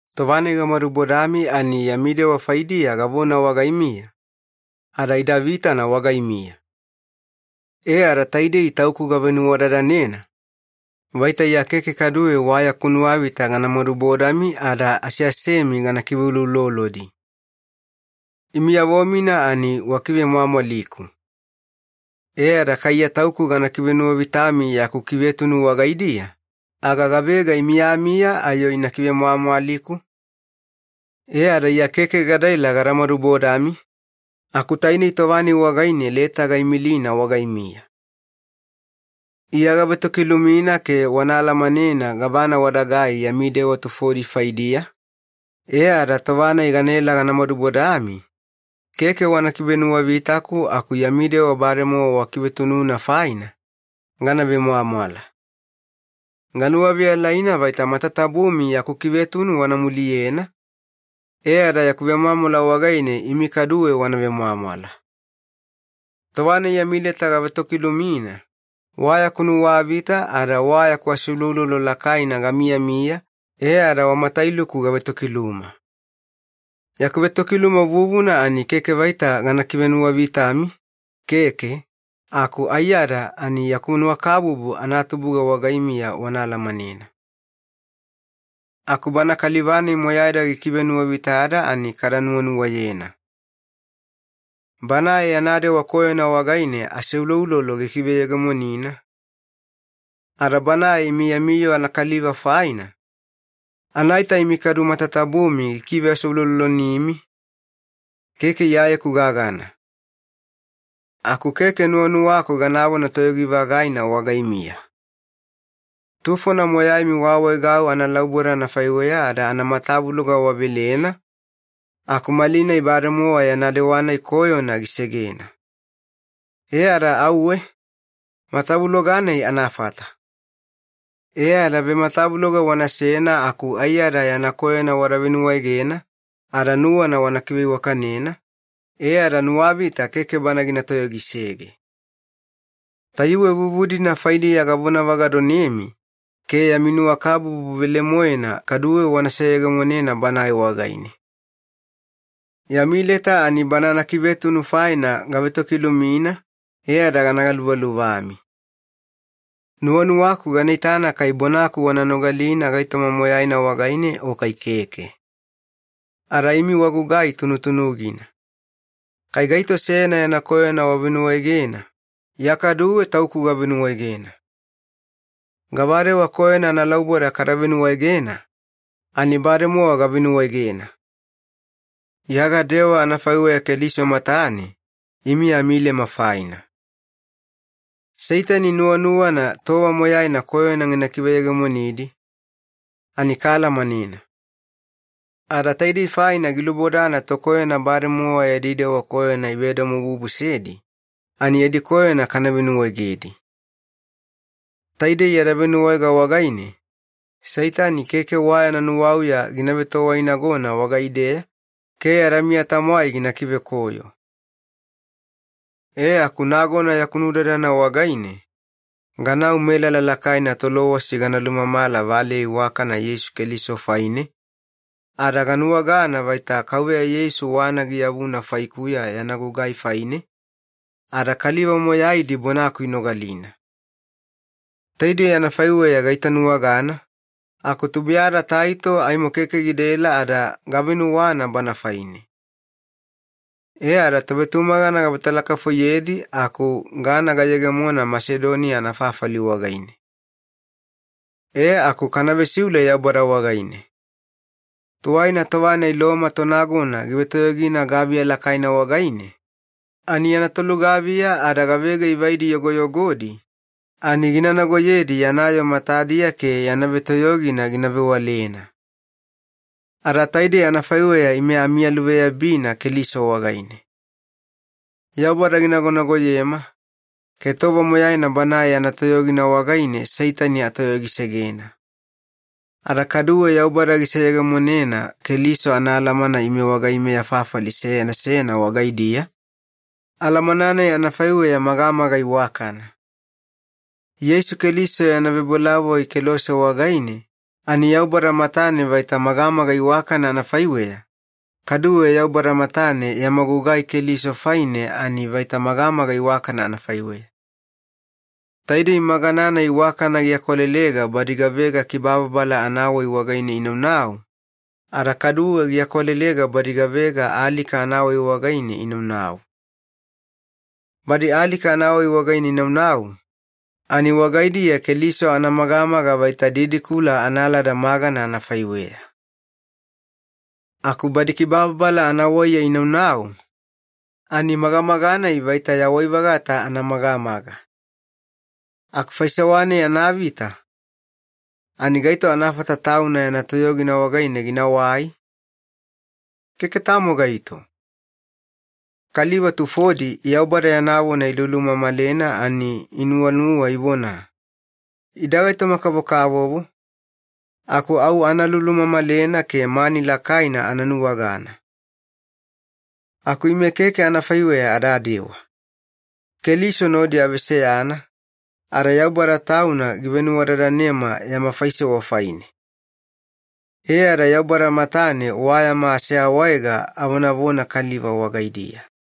Tova-nai gamadubodami ani yami dewa faidiya gavona wagaimiya, ada ida vitana wagaimiya. E ada taidei tauku gavenuwadadanena, vaita Iya keke kaduwe wa yaku nuwavita gana madubodami ada aseasemi gana kiveuloulolodi. Imiyavo-mina ani wakivemwamwaliku. E ada kai Iya tauku gana kivenuwavitami yaku kivetunu wagaidiya, aga gavega imiyamiya ayo ina kivemwamwaliku? E ada Iya keke gadaela gada madubodami, aku tainei tova-nai wagaine leta gaimilina wagaimiya. Iya gavetokilumina ke wana alamanena gavana wadagai yami dewa tufodi faidiya, e ada tova-nai ganaela gana madubodami, keke wana kivenuwavitaku aku yami dewa bademowa wakivetununa faina, gana vemwamwala. Ganuwaveyalaina vaita matatabumi yaku kivetunu wana muliyena, e ada yaku vemwamwala wagaine imi kaduwe wana vemwamwala. Tova-nai yami leta gavetokilumina, wa yaku nuwavita ada wa yaku aseuloulolo lakaina gamiyamiya e ada wa matailuku gavetokiluma. Yaku vetokiluma vuvuna ani keke vaita gana kivenuwavitami, keke, aku aiyada ani yaku nuwakabubu anatubuga wagaimiya wana alamanena. Aku bana kaliva-nai moyaida gikivenuwavitada ani kada nuwanuwayena. Banae yana dewa koyona wagaine aseuloulolo gikiveyegemonina, ada banae imi yami yoo anakaliva faina, anaita imi kadu matatabumi gikiveaseuloulolonimi, keke Iyayeku gagana. Aku keke nuwanuwaku ganavona toyogi-vagaina wagaimiya. Tufona moyaimi waawaegau analauboda anafaiweya ada anamatavuloga wavelena, aku malinai bademowa yana dewa-nai koyona gisegena. E ada auwe, matavuloga-nai anafata. E ada vematavuloga wanasena aku aiyada yana koyona wada venuwaegena ada nuwana wana kiveiwakanena, e ada nuwavita keke bana gina toyogisege. Tayuwe vuvu-dina faidiya gavonavagadonemi ke yami nuwakabubu velemoena kaduwe wana seyegemonena banae wagaine. Yami leta ani bana anakivetunu faina gavetokilumina e ada gana galuvaluvami. Nuwanuwaku gana itana kai bonaku wana nogalina gaitoma moyaina wagaine o kai keke. Ada imi wagugai tunutunugina. Kai gaito seyana yana koyona wavenuwaegena, Iya kaduwe tauku gavenuwaegena. Gavadewa koyona analauboda kada venuwaegena, ani bademowa gavenuwaegena. Iya gadewa anafaiweya Keliso matane imi amilema faina. Seitani nuwanuwana tova moyaina koyona gina kiveyegemonidi, ani kaalamanena. Ada taidei faina gilubodana tokoyona bademowa yadi dewa koyona ivedomobubusedi, ani yadi koyona kana venuwaegedi. Taidei yada venuwaege wagaine, Seitani keke wa yana nuwauya gina vetowainagona wagaideya ke yada miya-tamwai gina kivekoyo. E aku nagona yaku naudadana wagaine, ganau melala lakaina Tolowasi gana lumamala valeya iwakana Yeisu Keliso faine, ada ganuwagana vaita Kauveya Yeisu wana giyavuna faikuya yana gugai faine, ada kaliva moyaidi bonaku inogalina. Taidei anafaiweya gaitanuwagana, aku tubuiyada Taito aimo keke gidaela ada gavenuwana bana faine. E ada tovetumagana gavetalakafoiyedi aku gana gayegemona Masedoniya anafafali wagaine. E aku kana vesiule Yaubada wagaine. Tuwaina tova-nai Loma tonagona givetoyogina gaviya lakaina wagaine, ani yana tolugaviya ada gavega ivaidi yogoyogodi ani gina nagoyedi yana yoo matadiya ke yana vetoyogina gina vewalena. Ada taidei anafaiweya ime amiyaluveyabina Keliso wagaine. Yaubada ginagonagoyema, ke tova moyaina Banae yana toyogina wagaine Seitani atoyogisegena. Ada kaduwe Yaubada giseyegemonena Keliso anaalamana ime wagaimeya fafali seyana seyana wagaidiya, alamana-nai anafaiweya magamaga iwakana. Yeisu Keliso yana vebolavoi kelose wagaine, ani Yaubada matane vaita magamaga iwakana anafaiweya, kaduwe Yaubada matane yama gugai Keliso faine ani vaita magamaga iwakana anafaiweya. Taidei magana-nai iwakana giakwalelega badi gavega kibababala anawai wagaine inaunau, ada kaduwe giakwalelega badi gavega alika anawai wagaine inaunau. Badi alika anawai wagaine inaunau, ani wagaidiya Keliso anamagamaga vaita didikula analada magana anafaiweya. Aku badi kibababala anawaiya inaunau, ani magamaga-nai vaita yawai-vagata anamagamaga. Aku faisewa-nai anavita, ani gaito anafata tauna yana toyogina wagaine ginawai? Keke tamo gaito. Kaliva tufodi Yaubada yana vona ilulumamalena ani inuwanuwa ivona, “Ida gaitoma-kavokavovo, aku au ana lulumamalena ke mani lakaina ana nuwagana.” Aku ime keke anafaiweya adadewa. Keliso nodi aveseyana, ada Yaubada Tauna givenuwadadanema yama faisewa faine. E ada Yaubada matane wa yama aseawaega avonavona kaliva wagaidiya.